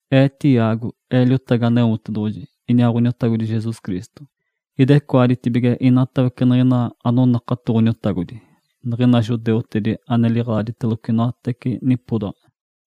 Ee, Tiago, ee liotagi Aneotedoɡ̶oji iniaa Ǥoniotagodi Jesus Cristo. Idecoaditibige inatawece niɡ̶ina anonakato Ǥoniotagodi, niɡ̶ina judeutedi ane ilaagiteloco inoatawece nipodaɡ̶a.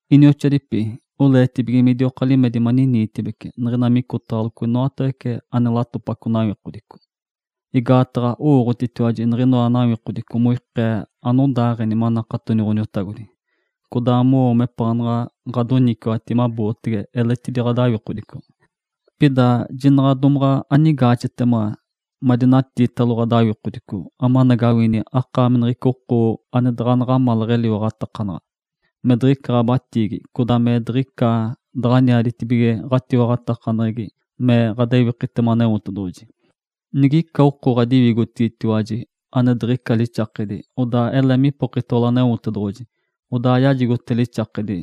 Inioxoadipi, oleetibige midioka limedi maniniitibece niɡ̶ina micotaɡ̶alocotiwaji inoatawece ane latopaco nawikodico. Igaataɡ̶a owooɡ̶otitiwaji niɡ̶inoa nawikodico moikee anodaaɡ̶eni manakatoni Ǥoniotagodi, codaa mowo mepaanaɡ̶a ɡ̶adoniciwati mabootege eletidi ɡ̶adawikodicotiwaji. Pida jinaɡ̶a domaɡ̶a anigaaxetiwaji madinatiitalo ɡ̶adawikodico amanagawini akaami niɡ̶ica oko ane daɡ̶a naɡ̶amalaɡ̶a metiwaɡ̶ataka, me diɡ̶ica ɡ̶abatiigi, codaa me diɡ̶icata daɡ̶aniaditibige ɡ̶atiwaɡ̶atakaneɡ̶egi me ɡ̶adewikitema Aneotedoɡ̶oji. Nigica oko ɡ̶adiwigotigitiwaji ane diɡ̶ica lixakedi, odaa ele me dipokotalo Aneotedoɡ̶oji, odaa ja yajigote lixakedi.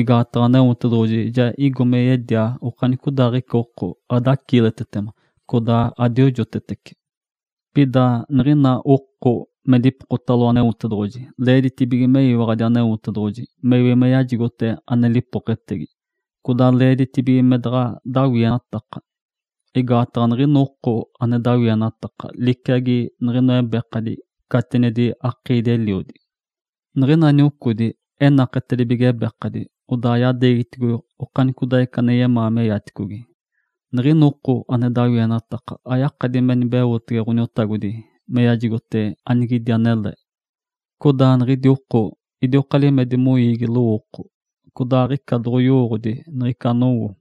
Igaataɡ̶a Aneotedoɡ̶oji ja igo me yedia okanicodaaɡ̶ica oko, adaciiletetema, codaa adiojotetece. Pida niɡ̶ina oko me dipokotalo Aneotedoɡ̶oji leeditibige meyiwaɡ̶adi Aneotedoɡ̶oji mewi me yajigote ane lipoketegi, codaa leeditibige me daɡ̶a dawienataka. Igaataɡ̶a niɡ̶ina oko ane dawienataka liciagi niɡ̶inoa ebekadi catinedi akiidi-eliodi. Niɡ̶ina niocodi enaketedibige ebekadi, odaa yadeegiticogi okanicodaaɡ̶ica ane yemaa meyaticogi. Niɡ̶ina oko ane dawienataka ayakadi me nibeotege Ǥoniotagodi me yajigote anigetiɡ̶idi anele. Codaa niɡ̶idi oko idioka limedi moiigi lowooko, codaa aɡ̶ica doɡ̶oyowooɡ̶odi niɡ̶ica anowo.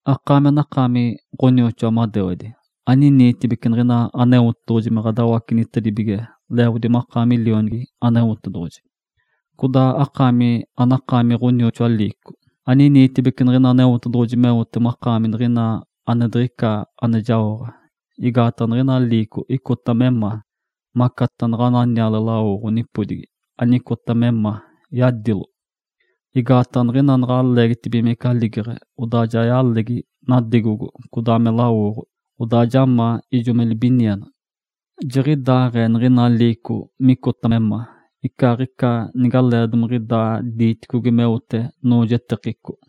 Akaami anakaami ɡ̶onioxoa madewedi, aniniitibece niɡ̶ina Aneotedoɡ̶oji me ɡ̶adawacenitedibige leeɡ̶odi makaami lionigi Aneotedoɡ̶oji. Codaa akaami anakaami ɡ̶onioxoa liico, aniniitibece niɡ̶ina Aneotedoɡ̶oji meote makaami niɡ̶ina ane diɡ̶ica ane jaoɡ̶a, igaataɡ̶a niɡ̶ina liico icota me ma, macataɡ̶a naɡ̶ana niale lawoɡ̶o nipodigipije anicota me ma, yadilo. Igaataɡ̶a niɡ̶ina naɡ̶a leegitibigimece aligeɡ̶e, odaa ja yalegi nadegogo codaa me lawoɡ̶o, odaa ja ma ijo me libinienaɡ̶a. Jiɡ̶idaaɡ̶ee niɡ̶ina liico micota me ma, icaaɡ̶ica nigaleeɡ̶idaa domaɡ̶a diiticogi meote noojetekico.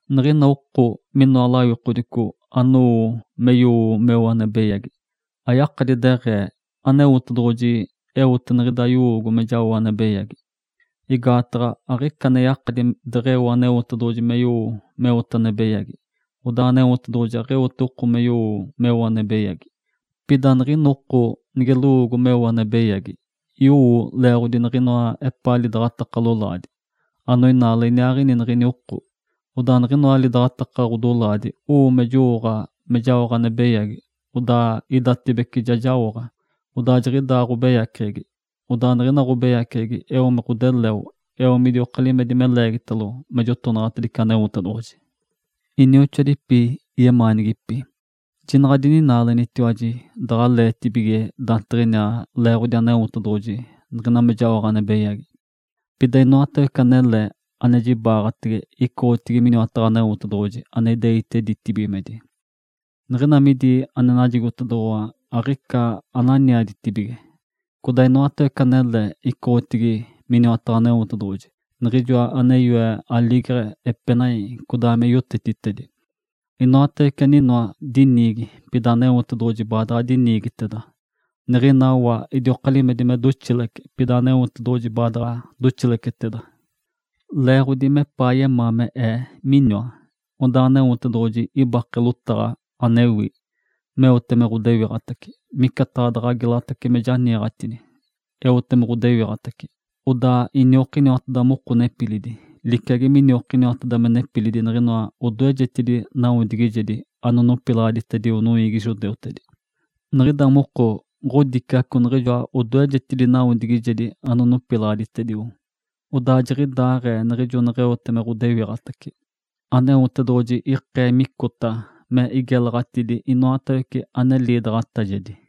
Niɡ̶ina oko minoa lawikodico anowo me yowo meo ane beyagi, ayakadi deɡ̶ee, “Aneotedoɡ̶oji eote niɡ̶ida yowoogo me jao ane beyagi.” Igaataɡ̶a aɡ̶ica ane yakadi deɡ̶eo Aneotedoɡ̶oji me yowo meote ane beyagi, odaa Aneotedoɡ̶oji aɡ̶eote oko me yowo meo ane beyagi. Pida niɡ̶ina oko nige lowoogo meo ane beyagi, yowo leeɡ̶otedi niɡ̶inoa epaa lidaɡ̶ataka lolaadi, anoinaale iniaaɡ̶ini niɡ̶ini oko. Odaa niɡ̶inoa lidaɡ̶ataka ɡ̶odolaadi owo me jowooɡ̶a me jaoɡ̶a ane beyagi, odaa idatibece ja jaoɡ̶a, odaa jiɡ̶ida ɡ̶obeyaceɡ̶egi. Odaa niɡ̶ina ɡ̶obeyaceɡ̶egi eo me ɡ̶odeleo, eo midioka limedi me leegitalo me jotonaɡ̶atedice Aneotedoɡ̶oji. Inioxoadipi yemaanigipi! Jinaɡ̶a adininaalenitiwaji daɡ̶aleetibige daantiɡ̶iniaa leeɡ̶odi Aneotedoɡ̶oji niɡ̶ina me jaoɡ̶a ane beyagi. Pida inoatawece anele ane jibaɡ̶atege icoɡ̶otedigi miniwataɡ̶a Aneotedoɡ̶oji ane ideite ditibigimedi. Niɡ̶ina midi ane najigotedoɡ̶owa aɡ̶ica ananiaditice. Codaa inoatawece anele icoɡ̶otedigi miniwataɡ̶a Aneotedoɡ̶oji, Niɡ̶ijoa ane yoe aligeɡ̶e, epenai, codaa me yotetitedi. Inoatawece aninoa diniigi, pida Aneotedoɡ̶oji baadaɡ̶a diniigiteda. Niɡ̶ina wa idioka limedi me doxilece, pida Aneotedoɡ̶oji baadaɡ̶a doxileceteda. Leeɡ̶odi mepaa yemaa me ee miniwa, odaa Aneotedoɡ̶oji ibake lotaɡ̶a, anewi, meote me ɡ̶odewiɡ̶atace, micataɡ̶a daɡ̶a gelatace me janiiɡ̶atini. Eote me ɡ̶odewiɡ̶atace, odaa iniokiniwateda moko nepilidi, liciagi miniokiniwateda me nepilidi niɡ̶inoa odoejedi nawodigijedi anonopilaɡ̶aditedio noiigi judeutedi. Niɡ̶ida moko ɡ̶odiciaco niɡ̶inoa odoejedi nawodigijedi anonopilaɡ̶aditedio, odaa jiɡ̶idaaɡ̶ee niɡ̶ijo neɡ̶eote me ɡ̶odewiɡ̶atace, Aneotedoɡ̶oji ikee micota me igelaɡ̶atidi inoatawece ane liidaɡ̶atajedi.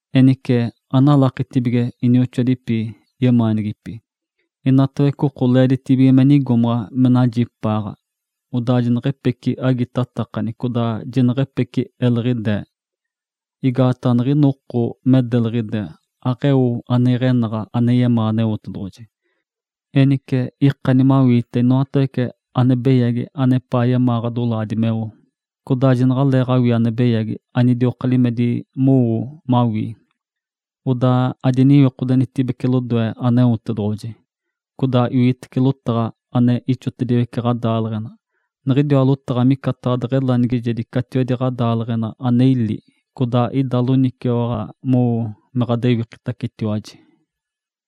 Enice, analakitibige inioxoadipi yemaanigipi! Inatawece oko leeditibige me nigomaɡ̶a me najipaaɡ̶a, odaa jineɡ̶epece agitatakani codaa jineɡ̶epece eliɡ̶idee. Igaataɡ̶a niɡ̶ina oko me deliɡ̶ide, aɡ̶eo ane iɡ̶enaɡ̶a ane yemaa Aneotedoɡ̶oji. Enice, ikani mawiite inoatawece ane beyagi anepaa yemaa ɡ̶adolaadi meo, codaa jinaɡ̶aleeɡ̶awii ane beyagi anidioka limeditibece mowoo mawii. Odaa adiniwikodenitibece lodoe Aneotedoɡ̶oji, codaa iwitece lotaɡ̶a ane ixotediwece ɡ̶adaaleɡ̶enali. Niɡ̶idiwa lotaɡ̶a micataɡ̶a deɡ̶elanigijedi catiwedi ɡ̶adaaleɡ̶ena ane ili, codaa ida loniciwaɡ̶a mowo me ɡ̶adewikitacetiwaji.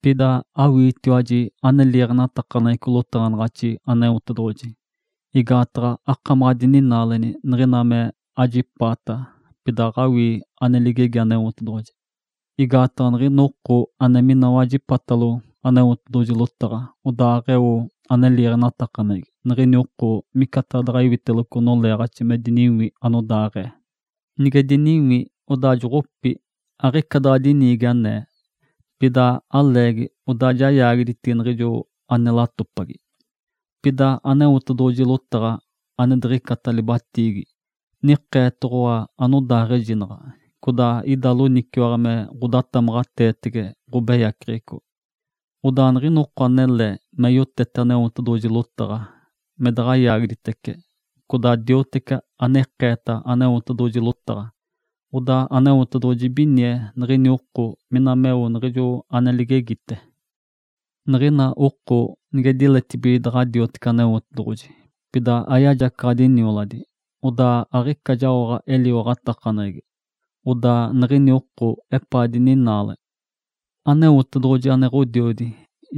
Pida awiitiwaji ane liiɡ̶enatakaneɡ̶eco lotaɡ̶anaɡ̶axi Aneotedoɡ̶oji. Igaataɡ̶a akamaɡ̶a adininaaleni niɡ̶ina mokajipaata, pida aɡ̶awii ane ligegi Aneotedoɡ̶oji. Igaataɡ̶a niɡ̶ina oko ane mina wajipatalo Aneotedoɡ̶oji lotaɡ̶a, odaa aɡ̶eo ane liiɡ̶enatakaneɡ̶egi, niɡ̶ini oko micataɡ̶a daɡ̶a iwiteloco noleeɡ̶axi me diniwi anodaaɡ̶ee. Nige diniwi, odaa joɡ̶opi, aɡ̶ica daɡ̶a diniigi anee. Pida aleegi, odaa ja yaagiditigi niɡ̶ijo ane latopagi. Pida Aneotedoɡ̶oji lotaɡ̶a, ane diɡ̶icata libatiigi, nikeetoɡ̶owa anodaaɡ̶ejinaɡ̶a, codaa ida loniciwaɡ̶a me ɡ̶odatamaɡ̶ateetege ɡ̶obeyaceɡ̶eco. Odaa niɡ̶ina oko anele me yowotece Aneotedoɡ̶oji lotaɡ̶a, me daɡ̶a yaagiditece, codaa me dioteci ane ikeeta Aneotedoɡ̶oji lotaɡ̶a, odaa Aneotedoɡ̶oji ibinie niɡ̶ini oko niɡ̶ina meo niɡ̶ijo ane ligegite. Niɡ̶ina oko nige diletibige daɡ̶a diotece Aneotedoɡ̶oji, pida ayajacaɡ̶adi nioladi, odaa aɡ̶ica jaoɡ̶ate eliwaɡ̶atakaneɡ̶egi. Odaa niɡ̶ini oko epaa dininaale. Aneotedoɡ̶oji, ane Ǥodiodi,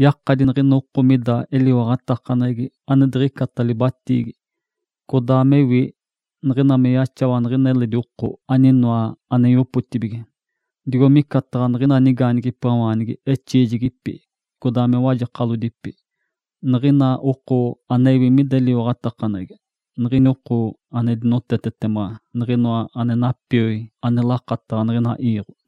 yakadi niɡ̶ina oko mida eliwaɡ̶atakaneɡ̶egi ane diɡ̶icata libatiigi, codaa mewi, niɡ̶ina me yaxawa niɡ̶ina eledi oko aninoa ane yopotibige, digo micataɡ̶a nigaanigipawaanigi exiijigipi, codaa me wajekalodipi. Niɡ̶ina oko anewi mida eliwaɡ̶atakaneɡ̶egi, niɡ̶ini oko ane dinotetetema niɡ̶inoa ane napioi ane lakataɡ̶a niɡ̶ina iiɡ̶o.